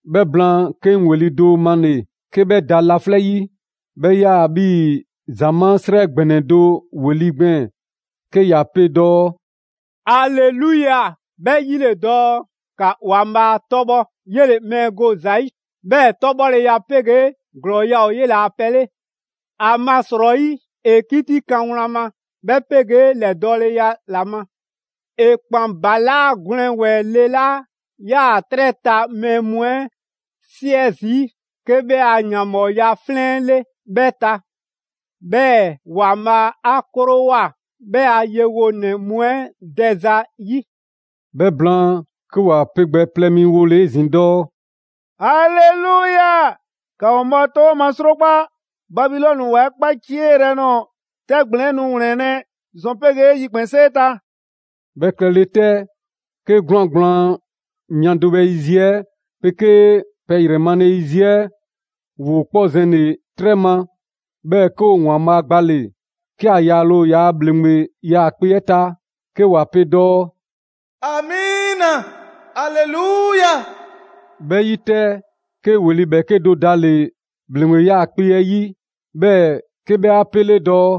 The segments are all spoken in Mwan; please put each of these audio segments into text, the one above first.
'Bhɛ blaan, 'ke 'ŋ ‑weli' do male‑ 'ke 'bhɛ laflɛ' 'yi, 'bhɛ 'yaa‑ 'bhii‑ ‑zamaa' 'srɛ ‑gbɛnɛ do ‑weli' gbɛɛn‑, 'ke ‑ya pe dɔɔ: «Aleluya! 'Bhɛ 'yi ‑le dɔɔ: ‑Ka ‑Waanbhaa' 'tɔbhɔ! 'Yele‑ mɛɛ go ‑za 'yi, 'bhɛɛ‑ 'tɔbhɔleya 'pegee ‑glɔɔya' ‑o 'yela‑ pɛ 'le! ‑Amasrɔyi, ‑e 'kitikan wlan ma, 'bhɛ 'pegee ‑lɛdɔɔleya ‑la ma! ‑E ‑kpan ‑balaa' 'gwlɛn ‑wɛɛ le 'la 'yaa‑ 'trɛ ta mɛɛ mu 'ɛ 'siɛ zii' 'ke 'bhɛ a ‑yanbhɔɔya 'flɛn 'ɛ 'le 'bhɛ ta, 'bhɛɛ‑ ‑Waanbhaa' 'a 'krowoa‑ 'bhɛ a yewonɛ mu 'ɛ dɛza 'yi.» 'Bhɛ blaan, 'ke ‑wa pe gbɛ plɛ mi wole‑ 'ezin‑ dɔɔ: «Aleluya! ‑Ka ‑Waanbhaa' 'tɔbhɔ ma 'srokpa! Babilɔni ‑wa 'ɛ 'kpacieyrɛ nɔɔ‑ 'tɛ ‑gblɛn 'ɛ nu ‑wlɛnlɛ' ‑zɔn 'pegee yikpɛnsee ta!» 'Bhɛ klɛle 'tɛ, 'ke 'gwlaan‑ gblaan mia do bhɛ yiziɛ 'ɛ 'pegee pɛ ‑yrɛ male yiziɛ 'ɛ ‑woo 'kpɔ zɛnle‑ 'trɛ ma, 'bhɛɛ‑ 'ke ‑o ‑Waanbhaa' gbale‑, 'ke ‑a yaale ‑o ‑yaa' ‑bhleŋgbe 'yaakpe‑ 'ɛ ta; 'ke ‑wa pe dɔɔ: «Amiina! Aleluya!» 'Bhɛ 'yi 'tɛ, 'ke ‑weli' 'bhɛɛke do dale‑ ‑bhleŋgbe 'yaakpe‑ 'ɛ 'yi, 'bhɛɛ‑ 'ke 'bhɛ 'a 'pele dɔɔ: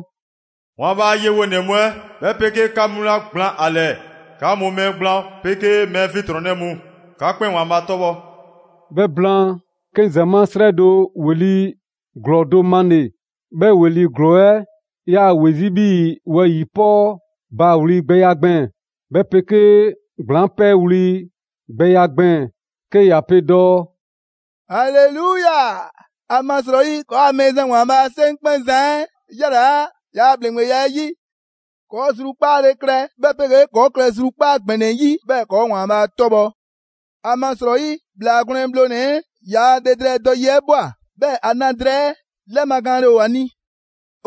«‑Waanbhaa' a yewonɛ mu 'ɛ, 'bhɛ 'pegee 'ka mu 'la gblaan ‑a ‑lɛɛ, 'ka mu mɛɛ gblaan 'pegee mɛɛ 'fiɛntrɔnnɛ mu, 'ka 'kpɛn ‑Waanbhaa' 'tɔbhɔ!» 'Bhɛ blaan, 'ke 'ŋ ‑zamaa' 'srɛ do ‑weli' ‑glɔɔ do male‑. 'Bhɛ ‑weli' ‑glɔɔ 'ɛ 'yaa‑ ‑we 'zi 'bhii‑ wɛyi‑ 'pɔɔ baawli gbɛya gbɛɛn‑, 'bhɛ 'pegee ‑gblaŋ' 'pɛɛwli‑ gbɛya gbɛɛn‑ 'ke ‑ya pe dɔɔ: «Aleluya! ‑Amasrɔyi ‑kɔɔa' Mɛɛzan Waanbhaa' 'Seŋkpɛnzan 'ɛ ‑yalaa' ‑yaa' ‑bhleŋgbeya 'ɛ 'yi. ‑Kɔɔ' zrukpaale klɛ, 'bhɛ 'pegee ‑kɔɔ' klɛ zrukpaa' ‑gbɛnɛ 'yi, 'bhɛɛ‑ ‑kɔɔ' ‑Waanbhaa' 'tɔbhɔ! ‑Amasrɔyi, ‑Bhlaa Gwlɛn Bhlonɛ‑ 'ɛ ‑yaa' le drɛɛ dɔ yi 'ɛ ꞊bhwa, 'bhɛɛ‑ ‑a na drɛɛ 'ɛ 'lɛmagaanle ‑o ‑a ni.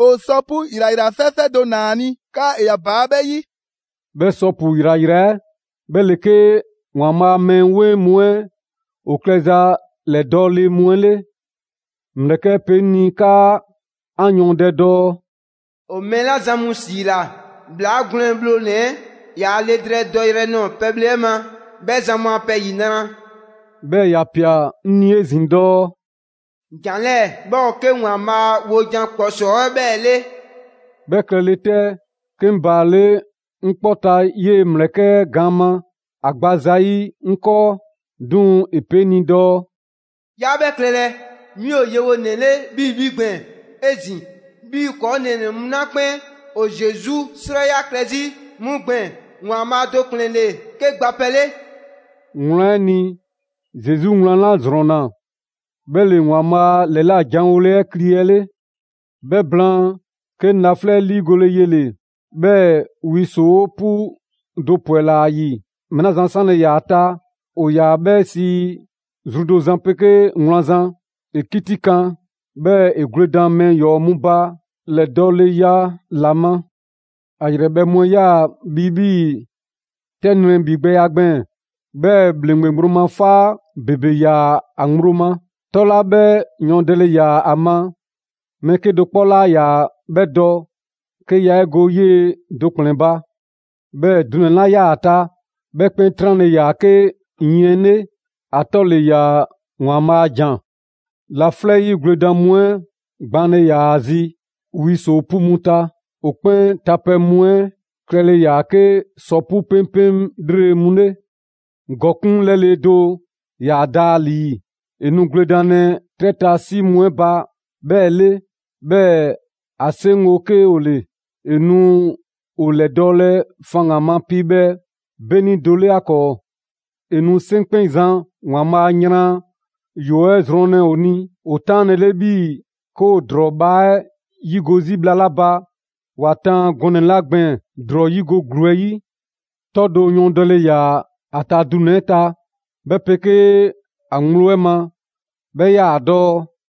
‑O sɔ 'pu ‑yrayra fɛɛfɛɛ do ‑naa ‑a ni 'kaa ‑e ‑ya ‑baa' 'bhɛ 'yi.» 'Bhɛ sɔ 'pu ‑yrayra 'ɛ 'bhɛ ‑le 'ke ‑Waanbhaa' a mɛɛ 'weŋ mu 'ɛ ‑o klɛza ‑lɛdɔɔle mu 'ɛ 'le. ‑Mlɛkɛ' 'ɛ pe 'ŋ ni 'kaa 'an yɔɔndɛ dɔɔ: «‑O mɛɛ 'la zan mu ‑siila ‑Bhlaa Gwlɛn Bhlonɛ‑ 'ɛ ‑yaa' le drɛɛ dɔyrɛ 'ɛ ꞊nɔɔ pɛbhle 'ɛ ma, 'bhɛ zan mu a pɛ ‑yinra'.» 'Bhɛɛ‑ ‑ya ꞊pia 'ŋ ni 'ezin‑ dɔɔ: «‑Jan 'lɛɛ‑ 'bhɛ ‑o 'ke ‑Waanbhaa wojan ‑kpɔsɔɔ 'ɛ 'bhɛɛ‑ 'le.» 'Bhɛ klɛlɛ 'tɛ, 'ke 'ŋ baale' 'ŋ 'kpɔ ta 'yee ‑mlɛkɛ' 'ɛ gaan ma, ‑a gba zayi' 'ŋ 'kɔɔ, 'duŋ‑ ‑e pe 'ŋ ni dɔɔ: «'Yaa 'bhɛ klɛlɛ, 'mi ‑o yewonɛ 'le 'bhii‑ 'bhi gbɛɛn‑ 'ezin‑, 'bhii‑ ‑kɔɔ' nɛɛnɛ‑ mu 'la 'kpɛn ‑o Zesu 'srɛya‑ klɛ 'zi 'mu gbɛɛn‑. ‑Waanbhaa' do ‑kplɛn ‑le 'ke gba pɛ 'le!» Wlan 'ɛ ni, Zesu wlan 'la ‑zrɔnna, 'bhɛ ‑le ‑Waanbhaa' ‑lɛlajanwole 'ɛ kli 'ɛ 'le. 'Bhɛ blaan, 'ke 'ŋ laflɛ' 'ɛ 'liigole yele‑, 'bhɛɛ‑ wi ‑soo' 'pu do ‑pwɛla ‑a ‑yi. Mɛɛ 'la zan 'sanle‑ ‑yaa ‑a ta ‑o ‑yaa 'bhɛ sii ‹Zru do Zan 'pegee Wlan Zan›. ‑E 'kitikan, 'bhɛɛ‑ ‑e gwledan mɛɛ ‑yɔɔ mu ba ‑lɛdɔɔleya ‑la ma. ‑A ‑yrɛbhɛ' mu 'ɛ 'yaa‑ bhi 'bhii‑ 'tɛ nrɛ ‑bhigbɛya gbɛɛn‑; 'bhɛɛ‑ ‑bhleŋgbe ŋgblo ma 'faa ‑bebe 'yaa‑ ‑a ŋgblo. 'Tɔ 'la 'bhɛ yɔɔndɛle ‑yaa ‑a ma, mɛɛ 'kedo‑ 'kpɔ 'laa ‑yaa 'bhɛ dɔ 'ke yaa 'e go 'yee‑ do ‑kplɛn ba. 'Bhɛɛ‑ dunɛ‑ 'la 'yaa‑ ‑a ta, 'bhɛ 'kpɛn 'tranle‑ ‑yaa 'ke yiɛn 'le. ‑A 'tɔ ‑le ‑yaa: «‑Waanbhaa' a ‑Jan.» Laflɛ' 'yi gwledan mu 'ɛ gbaanle ‑yaa ‑a zi wi ‑soo' 'pu mu ta. ‑O 'kpɛn tapɛ mu 'ɛ klɛle ‑yaa 'ke sɔ 'pu 'peŋpeŋ 'lrele‑ mu 'le. ‑Gɔkuŋ' 'lɛle‑ do ‑yaa da ‑a ‑lii; ‑e nu gwledanlɛ 'trɛ ta 'si mu 'ɛ ba 'bhɛɛ‑ 'le, 'bhɛɛ‑ ‑a 'seŋgo‑ 'ke ‑o ‑le. ‑E nu ‑o ‑lɛdɔɔlɛ faŋgan‑ ma piibhɛ 'beni do 'le 'a 'kɔɔ. ‑E nu 'Seŋkpɛnzan ‑Waanbhaa' a yran ‑yɔɔ' 'ɛ zrɔnlɛ ‑o ni ‑o 'taanlele 'bhii‑ 'ke ‑woo ‑drɔɔ bhaa 'ɛ 'yigo‑ 'zi bhla 'la ba ‑wa taan ‑o gaan 'le gɔnɛ‑ 'la gbɛɛn‑ ‑drɔɔ 'yigo‑ ‑gluu 'ɛ 'yi. 'Tɔ do yɔɔndɛle ‑yaa ‑a ta dunɛ‑ 'ɛ ta, 'bhɛ 'pegee ‑a ‑gblo 'ɛ ma, 'bhɛ 'yaa‑ dɔɔ: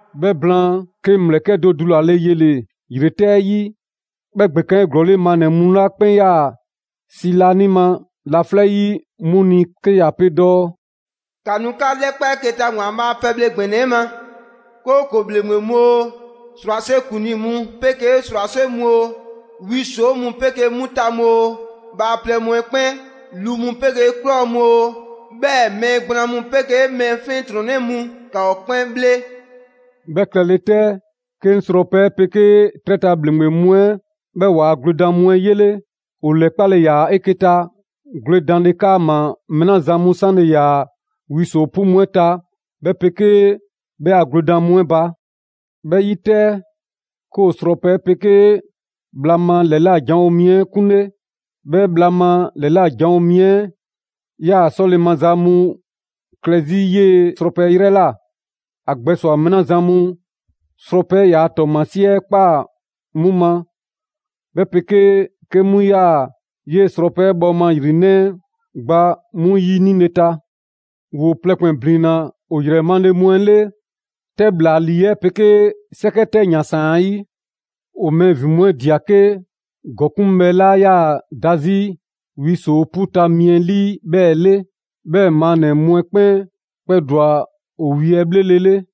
'Bhɛ blaan, 'ke 'ŋ ‑mlɛkɛ' do dulale yele‑ ‑yretɛbhɛ 'ɛ 'yi. 'Bhɛ ‑gbekaan 'eglɔɔle maannɛ‑ mu 'la 'kpɛn 'yaa‑ 'si laanima laflɛ' 'yi 'mu ni 'ke ‑ya pe dɔɔ: «‑Ka nu 'ka 'lɛkpa 'eke‑ ta ‑Waanbhaa' a pɛbhle ‑gbɛnɛ 'ɛ ma! 'Kooko‑ ‑bhleŋgbe mu oo, 'srwase ‑kuŋlii mu 'pegee 'srwase mu oo, wi ‑soo' mu 'pegee 'mu ta mu oo, bhaaplɛŋ mu 'ɛ 'kpɛn, lu mu 'pegee ꞊klɔ mu oo, 'bhɛɛ‑ mɛɛ gblaan mu 'pegee mɛɛ 'fiɛntrɔnnɛ mu, ‑ka ‑o 'kpɛn 'bhle.» 'Bhɛ klɛle 'tɛ, 'ke 'ŋ srɔpɛ 'ɛ 'pegee 'trɛ ta ‑bhleŋgbe mu 'ɛ, 'bhɛɛ‑ ‑waa' gwledan mu 'ɛ 'yele. ‑O ‑lɛkpale ‑yaa' 'eke‑ ta gwledanle 'kaama‑ mɛɛ 'la zan 'sanle‑ ‑yaa wi ‑soo' 'pu 'ɛ ta 'bhɛ 'pegee 'bhɛ a gwledan mu 'ɛ ba. 'Bhɛ 'yi 'tɛ, 'ke ‑o srɔpɛ 'ɛ 'pegee bhla ma ‑lɛla' janwo mi 'ɛ 'kunle. 'Bhɛ bhla ma ‑lɛla' janwo mi 'ɛ 'yaa‑ 'sɔle‑ maza mu klɛ 'zi 'yee‑ srɔpɛ 'ɛ 'yrɛ ꞊la. ‑A gbɛswa‑ mɛɛ 'la zan mu srɔpɛ 'ɛ ‑yaa' 'tɔɔmasie 'ɛ ꞊kpaa 'mu ma, 'bhɛ 'pegee 'ke 'mu 'yaa‑ 'yee‑ srɔpɛ 'ɛ bhɔɔma ‑yrinɛ' 'ɛ gba 'mu ‑yinile ta. ‑Woo plɛ 'kpɛn ‑blinna ‑o ‑yrɛ male mu 'ɛ 'le 'tɛ ‑bhlalii 'ɛ 'pegee 'sɛkɛ 'tɛ ‑yansaan 'ɛ 'yi. ‑O mɛɛ ‑vin mu 'ɛ ꞊dia 'ke ‑gɔkuŋbhɛ 'la 'yaa‑ da 'zi wi ‑soo' 'pu ta mi 'ɛ 'lii 'bhɛɛ‑ 'le. 'Bhɛɛ‑ maannɛ‑ mu 'ɛ 'kpɛn kpɛdwa‑ ‑o wi 'ɛ 'bhlelele.